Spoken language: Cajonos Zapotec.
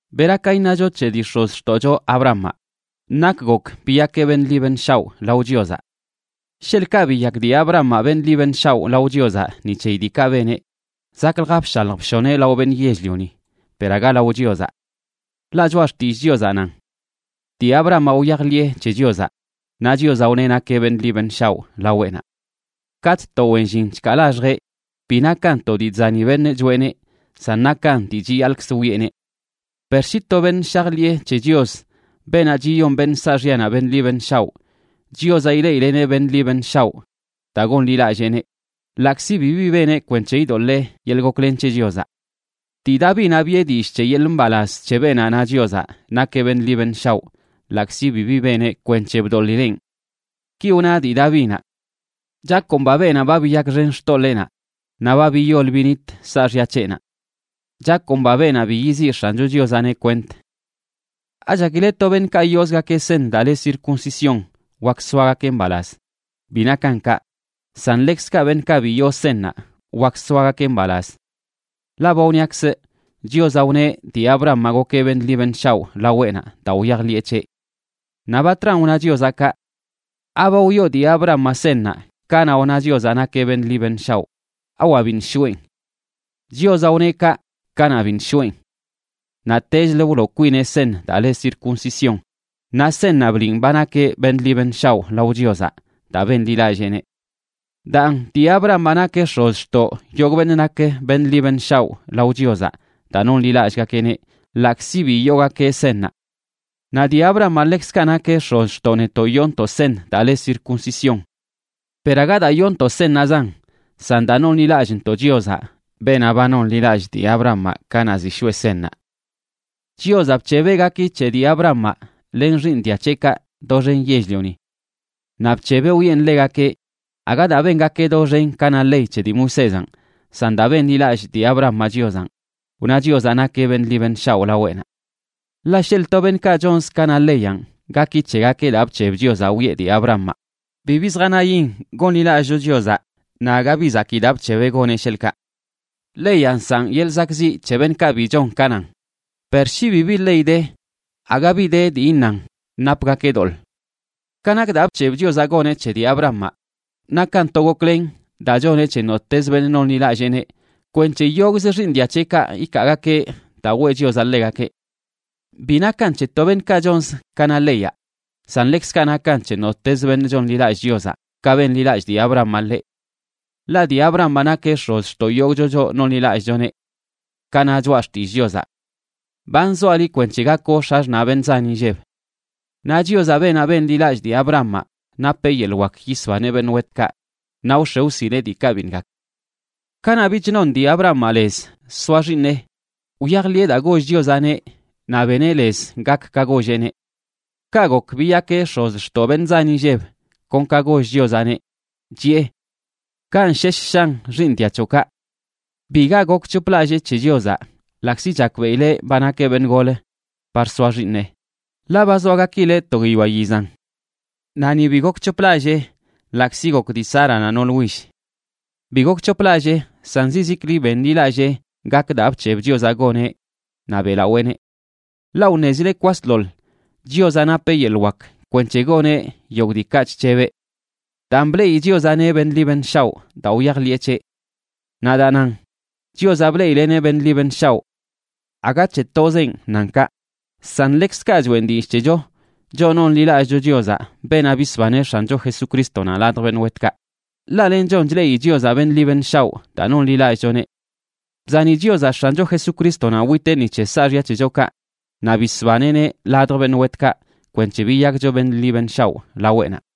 ¿Bera ka iṉacho c̱he dii x̱ozxtoꞌcho Abrahamaꞌ? Nak gok biyakeꞌ beṉꞌ ḻi beṉꞌ shaoꞌ lao Chiozaꞌ. Sheḻꞌkaꞌ biyak dii Abrahamaꞌ beṉꞌ ḻi beṉꞌ shaoꞌ lao Chiozaꞌ ni c̱heyi diikaꞌ beneꞌ, zaklja bshalj bshoneꞌ lao beṉꞌ yell-lioni, per aga lao Chiozaꞌ. Ḻaꞌ Choꞌa Xtillꞌ Chiozaꞌ nan: “Dii Abrahamaꞌ wyajḻiꞌe c̱he Chiozaꞌ, naꞌ Chiozaꞌ wneꞌ nakeꞌ beṉꞌ ḻi beṉꞌ shaoꞌ laweꞌnaꞌ.” Katꞌ to wen llin chkaa laxjeꞌ, bi nakan to dii chzani beṉꞌ choꞌeneꞌ, san nakan dii chiyaḻꞌkz wiꞌeneꞌ. Per shi to beṉꞌ shajḻiꞌe c̱he Chios, beenaꞌ chiyon beṉꞌ saaxyanaꞌ beṉꞌ ḻi beṉꞌ shaoꞌ, Chiozaꞌ ileꞌileꞌneꞌ beṉꞌ ḻi beṉꞌ shaoꞌ daa gonḻilalleeneꞌ, ḻaꞌkzi bibi beneꞌ kwenc̱he idoḻee yeḻꞌ goklen c̱he Chiozaꞌ. Dii Davinaꞌ biꞌe dillꞌ c̱he yeḻꞌ mbalaz c̱he beenaꞌ na Chiozaꞌ nakeꞌ beṉꞌ ḻi beṉꞌ shaoꞌ ḻaꞌkzi bibi beneꞌ kwenc̱he bdoḻileꞌn. Ki wna dii Davinaꞌ: Chakomba beenaꞌ ba biyakxen xtoḻeenaꞌ, naꞌ ba biyol binit saaxya c̱heꞌnaꞌ. Chakomba beenaꞌ bi yiziꞌ X̱ancho Chiozaꞌneꞌ kwent. ¿Achakile to beṉꞌkaꞌ yoozgakeꞌ seṉ daa le circuncisión wak soagakeꞌ mbalaz? Bi nakan kaꞌ, san ḻekzkaꞌ beṉꞌkaꞌ bi yoo seṉnaꞌ wak soagakeꞌ mbalaz. Ḻaꞌ ba wniakzꞌ Chiozaꞌ wneꞌ dii Abrahamaꞌ gokeꞌ beṉꞌ ḻi beṉꞌ shaoꞌ laweꞌnaꞌ daa wyajḻiꞌe c̱heꞌ. Naꞌ ¿batran wna Chiozaꞌ kaꞌ? ¿Aba wyoo dii Abrahamaꞌ seṉnaꞌ kanaꞌ wna Chiozaꞌ nakeꞌ beṉꞌ ḻi beṉꞌ shaoꞌ? ¿Awa biṉꞌ shoꞌen? Chiozaꞌ wneꞌ kaꞌ kanaꞌ biṉꞌ shoꞌen. Naꞌtechlə wloo kwineꞌ seṉ daa le circuncisión naꞌ seṉnaꞌ bliꞌn ba nakeꞌ beṉꞌ ḻi beṉꞌ shaoꞌ lao Chiozaꞌ daa benḻilalleeneꞌ. Daan, dii Abrahamaꞌ nakeꞌ x̱ozxtoꞌ yogꞌ beṉꞌ nak beṉꞌ ḻi beṉꞌ shaoꞌ lao Chiozaꞌ daa nonḻilallꞌgakeꞌneꞌ, ḻaꞌkzi bi yoogakeꞌ seṉnaꞌ. Naꞌ dii Abrahamaꞌ ḻekzkaꞌ nakeꞌ x̱ozxtoꞌ netoꞌ yoontoꞌ seṉ daa le circuncisión. Per aga daa yoontoꞌ seṉnaꞌzan, san daa nonḻilallꞌntoꞌ Chiozaꞌ, beenaꞌ ba nonḻilallꞌ dii Abrahamaꞌ kanaꞌ ziꞌ shoꞌe seṉnaꞌ. Chiozaꞌ bc̱hebeꞌ gaki c̱he dii Abrahamaꞌ len xiiṉ dia c̱heꞌkaꞌ doxen yell-lioni. Naꞌ bc̱hebeꞌ wiꞌen ḻegakeꞌ aga daa bengakeꞌ doxen ka na ley c̱he dii Moisézanꞌ, san daa benḻilallꞌ dii Abrahamaꞌ Chiozanꞌ, wna Chiozaꞌ nakeꞌ beṉꞌ ḻi beṉꞌ shaoꞌ laweꞌnaꞌ. Ḻaꞌ sheḻꞌ to beṉꞌkaꞌ chonz ka na leyanꞌ gaki c̱hegakeꞌ daa bc̱heb Chiozaꞌ wiꞌe dii Abrahamaꞌ, bibi zjanayin gonḻilallꞌcho Chiozaꞌ naꞌ aga bi zakii daa bc̱hebeꞌ goneꞌ, sheḻꞌkaꞌ. Leyaꞌ nsaꞌn yeḻꞌ zakꞌziꞌ c̱he beṉꞌkaꞌ bi chon ka nan. Per shi bibi ley de, aga bi de dii iṉan napgakeꞌ doḻꞌ. Ka nak daa bc̱heb Chiozaꞌ goneꞌ c̱he dii Abrahamaꞌ, nakan to goklen daa choneꞌ c̱he nottez beṉꞌ nonḻilalleeneꞌ kwenc̱he yogꞌzə xiiṉ dia c̱heꞌkaꞌ ikaagakeꞌ daa weꞌ Chiozaꞌ ḻegakeꞌ. Bi nakan c̱he to beṉꞌkaꞌ chonz ka na leyaꞌ, san ḻekzkaꞌ nakan c̱he nottezə beṉꞌ chonḻilallꞌ Chiozaꞌ ka benḻilallꞌ dii Abrahamaꞌ ḻeꞌ. Ḻaꞌ dii Abrahamaꞌ nakeꞌ x̱ozxtoꞌ yogꞌcho choꞌ nonḻilallꞌchoneꞌ. Ka na Choꞌa Xtillꞌ Chiozaꞌ: “Ba nzoaꞌ liꞌ kwenc̱he gakoꞌ x̱axṉaꞌ beṉꞌ zan inlleb.” Naꞌ Chiozaꞌ, beenaꞌ benḻilallꞌ dii Abrahamaꞌ, napeꞌ yeḻꞌ wak yisbaneꞌ beṉꞌ wetkaꞌ naꞌ wx̱e wsileꞌ diikaꞌ biṉꞌ gak. Kanaꞌ bich non dii Abrahamaꞌ lez soa xiiṉeꞌ, wyajḻiꞌe daa goll Chiozaꞌneꞌ naꞌ beneꞌ lez gak ka golleꞌneꞌ. Kaꞌ gok biyakeꞌ x̱ozxtoꞌ beṉꞌ zan inlleb, kon ka goll Chiozaꞌneꞌ, chiꞌe: “Kanꞌ shesh shan xiiṉ dia c̱hoꞌkaꞌ.” Biga gokc̱hoplallee c̱he Chiozaꞌ, ḻaꞌkzi chakbeꞌileꞌ ba nakeꞌ beṉꞌ golə par soa xiiṉeꞌ, ḻaꞌ ba zoa gakileꞌ to guiyoa yizan. Naꞌ ni bi gokc̱hoplallee ḻaꞌkzi gok dii Sáranaꞌ nool will. Bi gokc̱hoplallee, san zizikli benḻilallee gak daa bc̱heb Chiozaꞌ goneꞌ naꞌ beꞌlaweeneꞌ. Ḻaꞌ wṉezileꞌ kwasḻoḻ Chiozaꞌ napeꞌ yeḻꞌ wak kwenc̱he goneꞌ yogꞌ diikaꞌ chc̱hebeꞌ. Daan bleꞌi Chiozaꞌneꞌ beṉꞌ ḻi beṉꞌ shaoꞌ daa wyajḻiꞌe c̱heꞌ. Naꞌ daa nan “Chiozaꞌ bleꞌileꞌneꞌ beṉꞌ ḻi beṉꞌ shaoꞌ”, aga c̱he tozenꞌ nan kaꞌ, san ḻekzkaꞌ choꞌen dillꞌ c̱hecho choꞌ nonḻilallꞌcho Chiozaꞌ, beenaꞌ bisbaneꞌ X̱ancho Jesucrístonaꞌ ladj beṉꞌ wetkaꞌ, ḻaꞌ lenchon chleꞌi Chiozaꞌ beṉꞌ ḻi beṉꞌ shaoꞌ daa nonḻilallꞌchoneꞌ. Bzani Chiozaꞌ X̱ancho Jesucrístonaꞌ witeꞌ ni c̱he saaxya c̱hechokaꞌ naꞌ bisbaneꞌneꞌ ladj beṉꞌ wetkaꞌ kwenc̱he biyakcho beṉꞌ ḻi beṉꞌ shaoꞌ laweꞌnaꞌ.